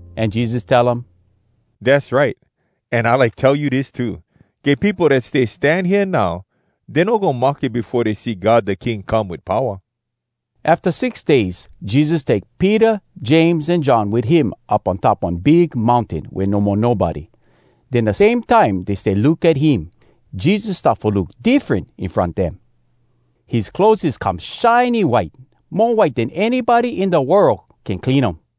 An Jesus tell um, “Dass right! An I like tell you dis too: Get peopo dat stay stan hea now, dey no goin mahke befo dey see God da King come wit powa.” Afta six days, Jesus take Peter, James, an John wit him up on top one big mountain wea no mo nobody. Den, da same time dey stay look at him, Jesus start fo look diffren in front dem. His clotheses come shiny white—mo white den anybody in da world can clean um.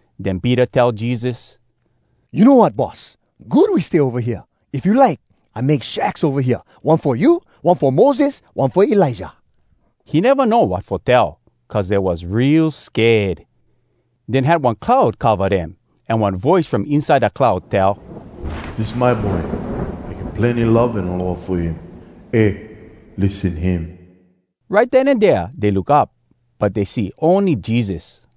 Den Peter tell Jesus, “You know wat, Boss? Good we stay ova hea! If you like, I make shacks ova hea, one fo you, one fo Moses, one fo Elijah.” He neva know wat fo tell, cuz dey was real sked. Den had one cloud cova dem, an one voice from inside da cloud tell, “Dis my boy. I get plenny love an aloha fo him. Eh, lissen him!” Right den an dea dey look up, but dey see ony Jesus.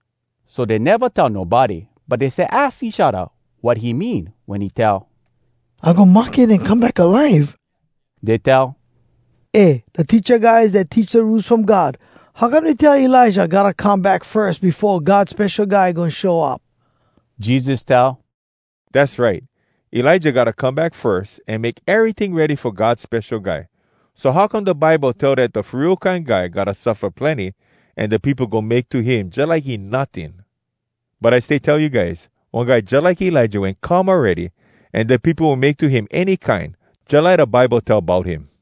So dey neva tell nobody, but dey stay aks each odda wat he mean wen he tell, “I goin mahke, den I goin come back alive.” Dey tell, “Eh, da teacha guys dat teach da Rules from God, how come dey tell Elijah gotta come back firs befo God Spesho Guy goin show up?” Jesus tell, “Dass right. Elijah gotta come back firs an make eryting ready fo God Spesho Guy. So how come da Bible tell dat da Fo Real Kine Guy gotta suffa plenny, an da peopo goin make to him jalike he notting? But I stay tell you guys, one guy jalike Elijah wen come awready, an da peopo wen make to him any kine, jalike da Bible tell bout him.”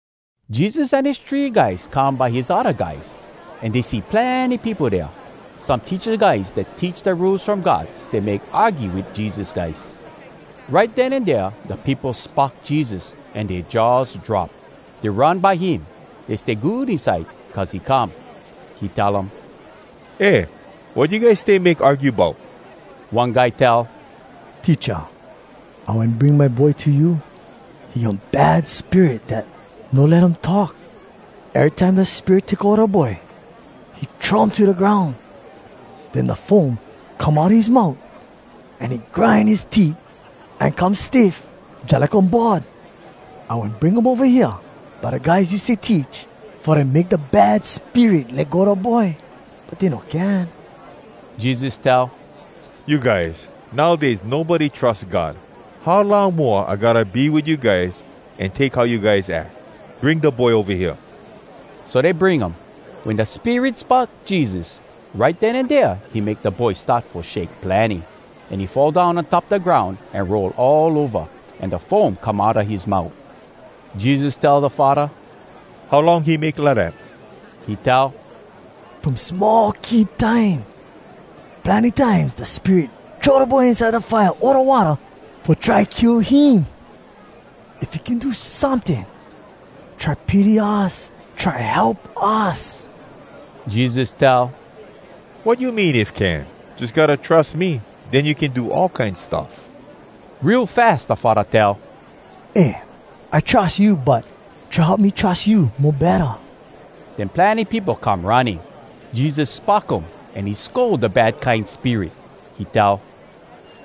Jesus an his three guys come by his odda guys, an dey see plenny peopo dea. Some teacha guys dat teach da Rules From God stay make argue wit Jesus guys. Right den an dea da peopo spock Jesus, an dea jaws drop. Dey run by him. Dey stay good inside cuz he come. He tell um, “Eh, wat you guys stay make argue bout?” One guy tell, “Teacha, I wen bring my boy to you. He get one bad spirit dat no let um talk. Erytime da spirit take ova da boy, he throw um to da groun. Den da foam come outa his mout, an he grind his teet, an come stiff jalike one board. I wen bring him ova hea by da guys you stay teach fo dem make da bad spirit let go da boy, but dey no can.” Jesus tell, “You guys! Nowdays nobody trus God! How long moa, I gotta be wit you guys an take how you guys ack? Bring da boy ova hea!” So dey bring um. Wen da spirit spock Jesus, right den an dea he make da boy start fo shake plenny, an he fall down on top da groun, an roll all ova, an da foam come outa his mout. Jesus tell da faddah, “How long he make lidat?” He tell, “From small kid time. Plenny times da spirit throw da boy inside da fire o da watta fo try kill him. If you can do someting, try pity us! Try help us!” Jesus tell “Wat you mean, ‘If can’? Jus gotta trus me, den you can do all kine stuff.” Real fas da faddah tell, “Eh, I trus you! But try help me trus you mo betta!” Den plenny peopo come running. Jesus spock um, an he scold da bad kine spirit. He tell,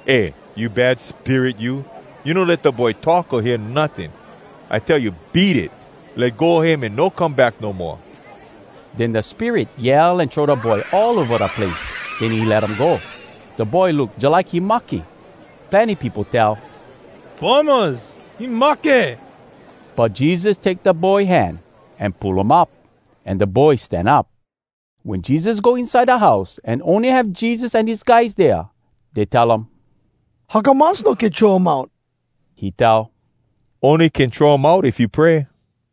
“Eh, you bad spirit, you! You no let da boy talk o hear notting. I tell you, beat it! Let go him an no come back no moa!” Den da spirit yell an throw da boy all ova da place, den he let um go. Da boy look jalike he mahke. Plenny peopo tell, “Bummahs! He mahke!” But Jesus take da boy hand, an pull um up. An da boy stan up. Wen Jesus go inside da house, an ony have Jesus an his guys dea, dey tell um, “How come us no can throw um out?” He tell, “Ony can throw um out if you pray.”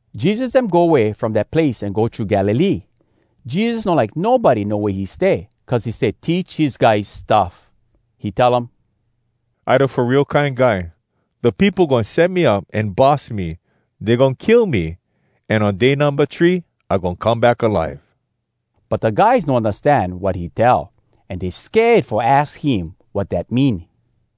Jesus dem go way from dat place an go thru Galilee. Jesus no like nobody know wea he stay, cuz he stay teach his guys stuff. He tell um, “I da Fo Real Kine Guy. Da peopo goin set me up, an bus me. Dey goin kill me, an on day numba three I goin come back alive.” But da guys no undastan wat he tell, an dey sked fo aks him wat dat mean.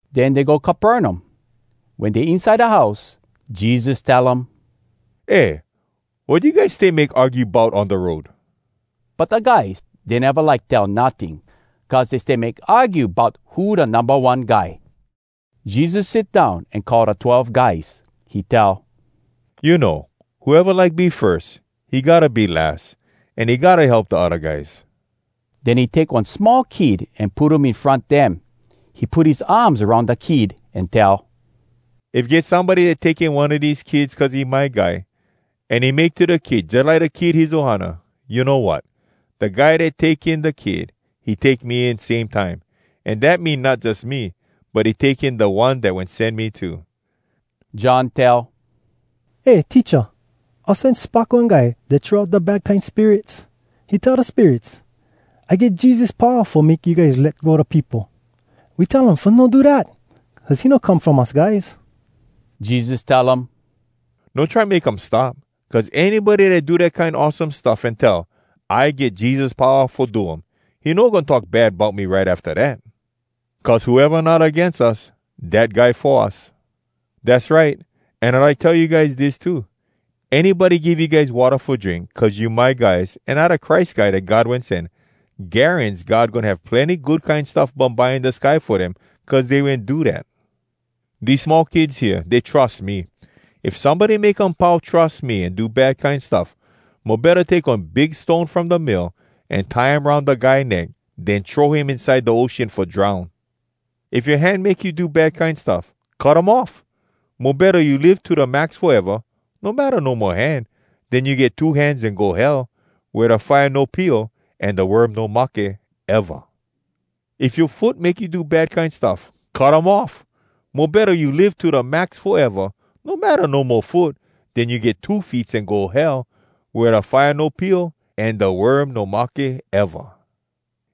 Den dey go Capernaum. Wen dey inside da house, Jesus tell um, “Eh, wat you guys stay make argue bout on da road?” But da guys, dey neva like tell notting, cuz dey stay make argue bout who da numba one guy. Jesus sit down an call da twelve guys. He tell, “You know, whoeva like be firs, he gotta be las, an he gotta help da odda guys.” Den he take one small kid an put um in front dem. He put his arms aroun da kid an tell, “If get somebody dat take in one a dese kids cuz he my guy, an he make to da kid jalike da kid his ohana, you know wat?! Da guy dat take in da kid, he take me in same time. An dat mean not jus me, but he take in da One dat wen sen me too!” John tell, “Eh, Teacha! Us wen spock one guy dat throw out da bad kine spirits. He tell da spirits, ‘I get Jesus powa fo make you guys let go da peopo!’ We tell um fo no do dat, cuz he no come from us guys.” Jesus tell um, “No try make um stop, cuz anybody dat do dat kine awesome stuff an tell, ‘I get Jesus powa fo do um,’ he no goin talk bad bout me right afta dat! Cuz whoeva not agains us, dat guy fo us. Dass right! An I like tell you guys dis too: Anybody give you guys watta fo drink cuz you my guys an I da Christ Guy dat God wen sen, garans God goin have plenny good kine stuff bumbye in da sky fo dem cuz dey wen do dat.” “Dese small kids hea, dey trus me! If somebody make um pau trus me an do bad kine stuff, mo betta take one big stoneg from da mill, an tie um aroun da guy neck, den throw him inside da ocean fo drown! If yoa hand make you do bad kine stuff, cut um off! Mo betta you live to da max foeva, no matta no mo hand, den you get two hands an go Hell, wea da fire no pio, an da worm no mahke, eva! If yoa foot make you do bad kine stuff, cut um off! Mo betta you live to da max foeva, no matta no mo foot, den you get two feets an go Hell, wea da fire no pio, an da worm no mahke, eva!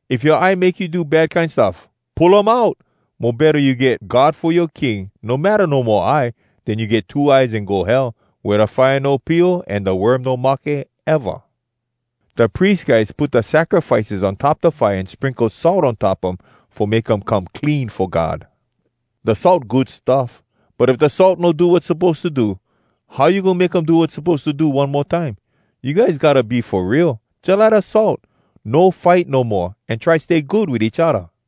If yoa eye make you do bad kine stuff, pull um out! Mo betta you get God fo yoa king, no matta no mo eye, den you get two eyes an go Hell, wea da fire no pio, an da worm no mahke, eva! “Da pries guys put da sacrifices on top da fire an sprinkle salt on top um fo make um come clean fo God. Da salt good stuff. But if da salt no do wat suppose to do, how you goin make um do wat suppose to do one mo time? You guys gotta be fo real, jalike da salt! No fight no moa, an try stay good wit each odda.”